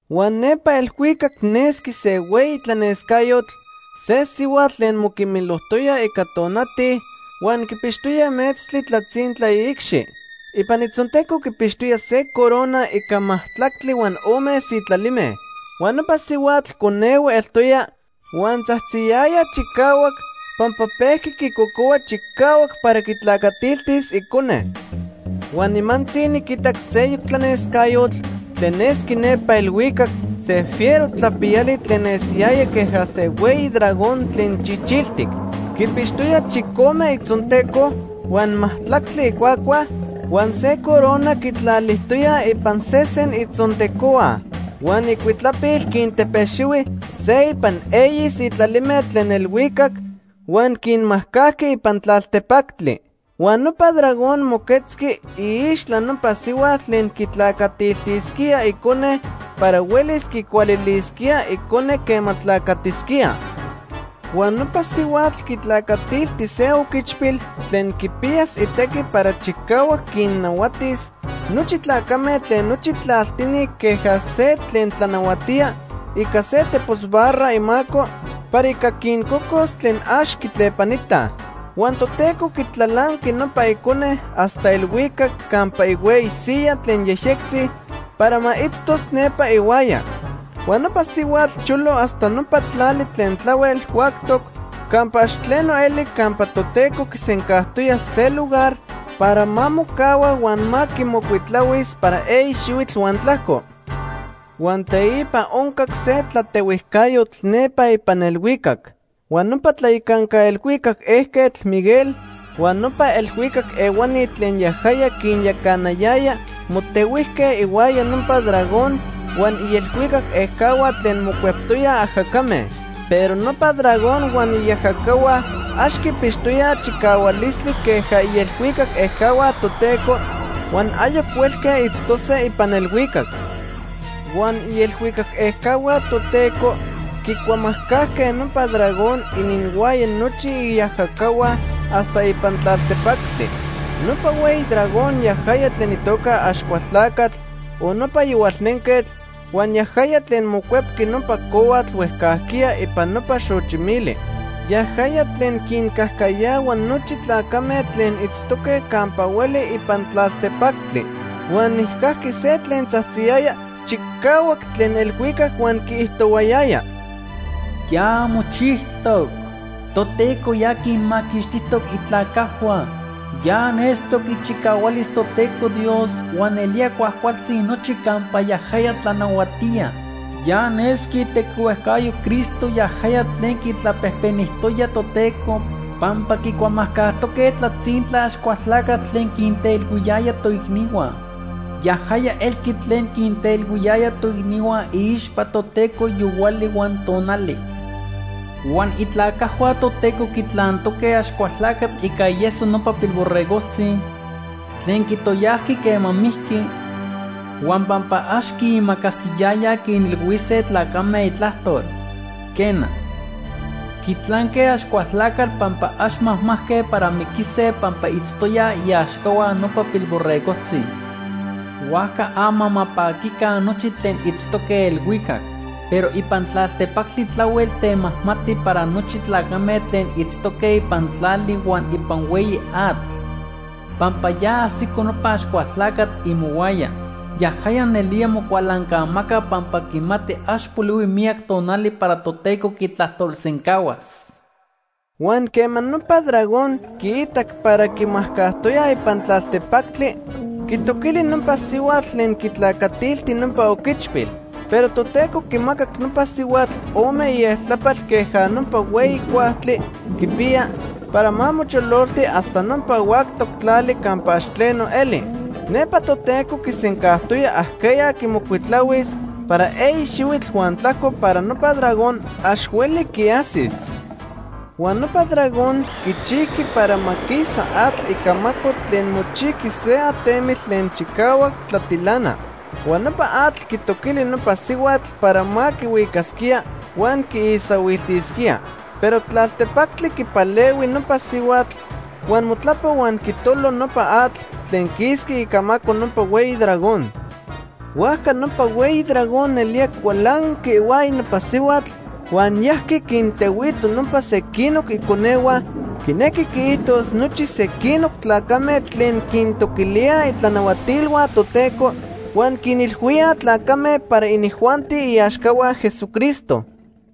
Huan nepa elhuicac nesqui se hueyi tlanescayotl, se sihuatl tlen moquimilijtoya ica tonati huan quipixtoya metztli tlatzintla iicxi. Ipan itzonteco quipixtoya se corona ica majtlactli huan ome sitlalime. Huan nopa sihuatl conehue eltoya huan tzajtziyaya chicahuac pampa pejqui quicocohua chicahuac para quitlacatiltis icone. Huan nimantzi niquitac seyoc tlanescayotl tlen nesqui nepa elhuicac, se fiero tlapiyali tlen nesiyaya queja se hueyi dragón tlen chichiltic. Quipixtoya chicome itzonteco, huan majtlactli icuacua, huan se corona quitlalijtoya ipan sesen itzontecohua. Huan icuitlapil quintepexihui se ipan eyi sitlalime tlen elhuicac huan quinmajcajqui ipan tlaltepactli. Huan nopa dragón moquetzqui iixtla nopa sihuatl tlen quitlacatiltisquía icone para huelis quicualilisquía icone quema tlacatisquía. Huan nopa sihuatl quitlacatilti se oquichpil tlen quipiyas itequi para chicahuac quinnahuatis nochi tlacame tlen nochi tlaltini queja se tlen tlanahuatía ica se tepos barra imaco para ica quincocos tlen ax quitlepanitaj. Huan Toteco quitlalanqui nopa icone hasta elhuicac campa ihueyi siyaj tlen yejyectzi para ma itztos nepa ihuaya. Huan nopa sihuatl cholo hasta nopa tlali tlen tlahuel huactoc campa ax tleno eli campa Toteco quisencajtoya se lugar para ma mocahua huan ma quimocuitlahuis para eyi xihuitl huan tlajco. Huan teipa oncac se tlatehuijcayotl nepa ipan elhuicac. Huan nopa tlayacanca elhuicac ejquetl, Miguel, huan nopa elhuicac ehuani tlen yajaya quinyacanayaya motehuijque ihuaya nopa dragón huan ielhuicac ejcahua tlen mocueptoyaj ajacame. Pero nopa dragón huan iajacahua ax quipixtoyaj chicahualistli queja ielhuicac ejcahua Toteco huan ayoc huelque itztose ipan elhuicac. Huan ielhuicac ejcahua Toteco quicuamajcajque nopa dragón ininhuaya nochi iajacahua hasta ipan tlaltepactli. Nopa hueyi dragón, yajaya tlen itoca Axcualtlacatl o nopa Yohualnenquetl, huan yajaya tlen mocuepqui nopa cohuatl huejcajquiya ipan nopa xochi mili. Yajaya tlen quincajcayahua nochi tlacame tlen itztoque campa hueli ipan tlaltepactli. Huan nijcajqui se tlen tzajtziyaya chicahuac tlen elhuicac huan quiijtohuayaya: “Ya mochijtoc. Toteco ya quinmaquixtijtoc itlacajhua. Ya nestoc ichicahualis Toteco Dios huan nelía cuajcualtzi nochi campa yajaya tlanahuatía. Ya nesqui itequihuejcayo Cristo yajaya tlen quitlapejpenijtoya Toteco, pampa quicuamajcajtoque tlatzintla Axcualtlacatl tlen quinteilhuiyaya toicnihua. Yajaya elqui tlen quinteilhuiyaya toicnihua iixpa Toteco yohuali huan tonali. Huan itlacajhua Toteco quitlantoque Axcualtlacatl ica ieso nopa Pilborregojtzi tlen quitoyajqui quema mijqui, huan pampa ax quiimacasiyayaj quinilhuise tlacame itlajtol. Quena, quitlanque Axcualtlacatl pampa ax majmajque para miquise pampa itztoyaj iaxcahua nopa Pilborregojtzi. Huajca ama ma paquica nochi tlen itztoque elhuicac. Pero ipan tlaltepactli tlahuel temajmati para nochi tlacame tlen itztoque ipan tlali huan ipan hueyi atl, pampa ya ajsico nopa Axcualtlacatl imohuaya. Yajaya nelía mocualancamaca pampa quimati ax polihui miyac tonali para Toteco quitlajtolsencahuas.” Huan quema nopa dragón quiitac para quimajcajtoyaj ipan tlaltepactli, quitoquili nopa sihuatl tlen quitlacatilti nopa oquichpil. Pero Toteco quimacac nopa sihuatl ome ieltlapal queja nopa hueyi cuajtli quipiya para ma mochololti hasta nopa huactoc tlali campa ax tleno eli. Nepa Toteco quisencajtoya ajqueya quimocuitlahuis para eyi xihuitl huan tlajco para nopa dragón ax hueli quiajsis. Huan nopa dragón quichijqui para ma quisa atl icamaco tlen mochijqui se atemitl tlen chicahuac tlatilana. Huan nopa atl quitoquili nopa sihuatl para ma quihuicasquía huan quiisahuiltisquía. Pero tlaltepactli quipalehui nopa sihuatl huan motlapo huan quitolo nopa atl tlen quisqui icamaco nopa hueyi dragón. Huajca nopa hueyi dragón nelía cualanqui ihuaya nopa sihuatl huan yajqui quintehuito nopa sequinoc iconehua, quinequi quiijtos nochi sequinoc tlacame tlen quintoquilíaj itlanahuatilhua Toteco huan quinilhuíaj tlacame para inijuanti iaxcahua Jesucristo.